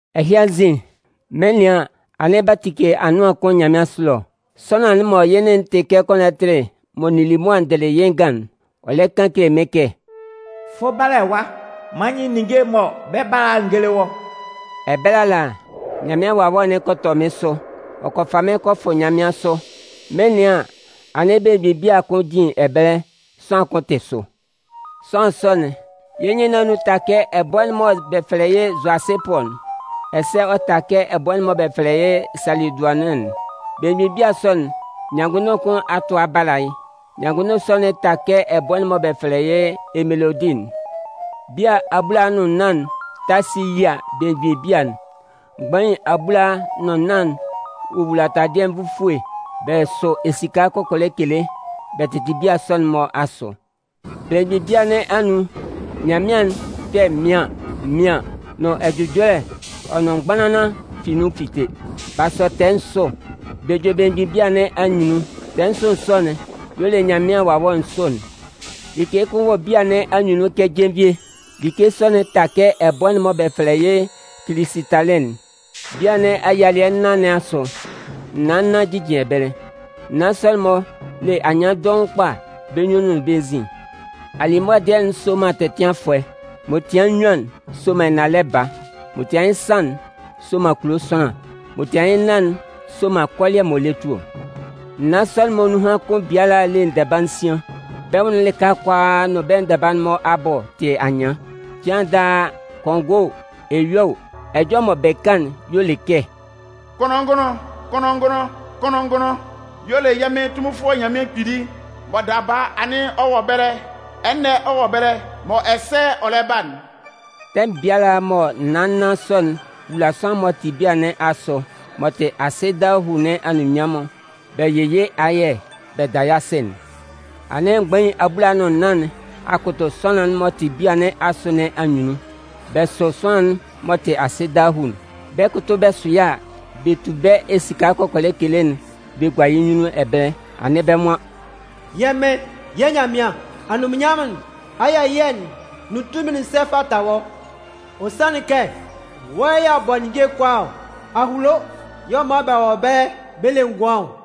Ɛhɩ anzin, mɩn 'nɩan an, anɩn b'a tike anʋan kʋn nyanmɩansʋ ɛlɔ. Sʋanlan'n mɔ yɩ́ nɩn'n te kɛ kɔnɔtɩ'n mɔ n nili mʋa n dɩlɩ yɩ́ ngan'n, ɔ lɛ kan kele mɩ́n kɛ: “Fʋ bala ɛwa nán man n yɩ́ ninnge'n mɔ bɛ 'ba a'n n géle wɔ́.” Ɛbɛlɛ ala, Nyanmɩan Wawɛ'n kɔ tɔ mɩ́n sʋ. Ɔ kɔ fa mɩ́n kɔ fʋ nyanmɩansʋ. Mɩn 'nɩan an, anɩn belemgbin bia kʋn jin ɛbɛlɛ, sʋanlan kʋn tɩ sʋ. Sʋanlan sɔ'n, yɩ́ nyɩn nɩn anun ta kɛ ɛbʋɛ'n mɔ bɛ fɛlɛ yɩ́ zʋasɩpʋ'n, ɛsɛ ɔ ta kɛ ɛbʋɛ'n mɔ bɛ fɛlɛ yɩ́ salɩdʋanɩn'n. Belemgbin bia sɔ'n, nyanngʋnndʋn kʋn a tʋ a bala yɩ́. Nyanngʋnndʋn sɔ'n ta kɛ ɛbʋɛ'n mɔ bɛ fɛlɛ yɩ́ emelodɩ'n. Bia abulaa nʋn nnan ta si yia belemgbin bia'n. Mgbain abulaa nʋn nnan wowula taladɩɛ nvufue, bɛ sʋ esika kɔkɔlɛ kele, bɛ tɩtɩ bia sɔ'n-mɔ asʋ. Belemgbin bia nɩn anun, nyanmɩan'n kpɛ mɩaɩn mɩaɩn nʋn ɛjʋjɔlɛ ɔ nʋn mgbanlanlan fi nun fite. B'a sɔ tɛɛ nsʋ. Bɛ jue belemgbin bia nɩn anyunnun. Tɛɛ nsʋ sɔ'n y'ɔ le Nyanmɩan Wawɛ nsʋ'n. Like kʋn wɔ bia nɩn anyunnun kɛ jenvie. Like sɔ'n ta kɛ ɛbʋɛ'n mɔ bɛ fɛlɛ yɩ́ kilisɩtalɩ'n. Bia nɩn ayialɩɛ nnan nɩn asʋ, naan nnan jijin ɛbɛlɛ. Naan sɔ'n-mɔ le anyɩan dɔʋn kpa bɛ́ nyunnun nʋn bɛ́ nzin. Alimʋa dɩɛ'n sɔman tɛtɩanfʋɛ. M'ɔ tɩan yɩ nnyuan'n soman ɛnalɛ baa. M'ɔ tian yɩ́ nsan'n soman kulo sʋanlan. M'ɔ tian yɩ́ nnan'n soman kɔlɩɛ m'ɔ lɛ tu ɔ. Naan sɔ'n-mɔ nunhan kʋn biala le ndɛba nsian. Bɛ́ nwʋn'n lɩka kʋalaa nʋn bɛ ndɛba'n-mɔ abʋ tɩ anyɩan. Cɩan daa, kɔngɔɛ o, eyua o, ɛjɔlɛ mɔ bɛ kan'n y'ɔ le kɛ: “Kʋnlʋn-ngʋnlʋn, kʋnlʋn-ngʋnlʋn, kʋnlʋn-ngʋnlʋn y'ɔ le yɛ́ Mɩn Tunminfʋɛ Nyanmɩan Kpili mɔ daba anɩn ɔ wɔ ɛbɛlɛ, ɛnɛ ɔ wɔ ɛbɛlɛ mɔ ɛsɛ ɔ lɛ 'ba'n.” Tɛmʋn biala mɔ naan nnan sɔ'n 'wula sʋanlan'n m'ɔ tɩ bia nɩn asʋ m'ɔ tɩ asɩ dahuu nɩn anunminnyanmʋn bɛ yɩ yɩ́ ayɛ bɛ da yɩ́ asɩ'n, anɩn mgbain abulaa nʋn nnan nɩn a kʋtʋ sʋanlan'n m'ɔ tɩ bia nɩn asʋ nɩn anyunnun, bɛ sʋ sʋanlan'n m'ɔ tɩ asɩ dahuu'n. Bɛ 'kʋtʋ bɛ sʋ yɩ́ a, bɛ tu bɛ́ esika kɔkɔlɛ kele'n bɛ gua yɩ́ nyunnun ɛbɛlɛ, anɩn bɛ́ nwan: “Yɛ́ Mɩn, yɛ́ Nyanmɩan, anunminnyanmʋn'n, ayɛ ɛyɩɛ'n nʋn tunmin'n sɛ fata wɔ́. Ɔ sanlɩn kɛ wɔ́ yɛ̂ a bɔ ninnge'n kʋalaa ɔ. A hulo y'ɔ man bɛ wɔ ɛbɛlɛ bɛ le ngʋan ɔ.”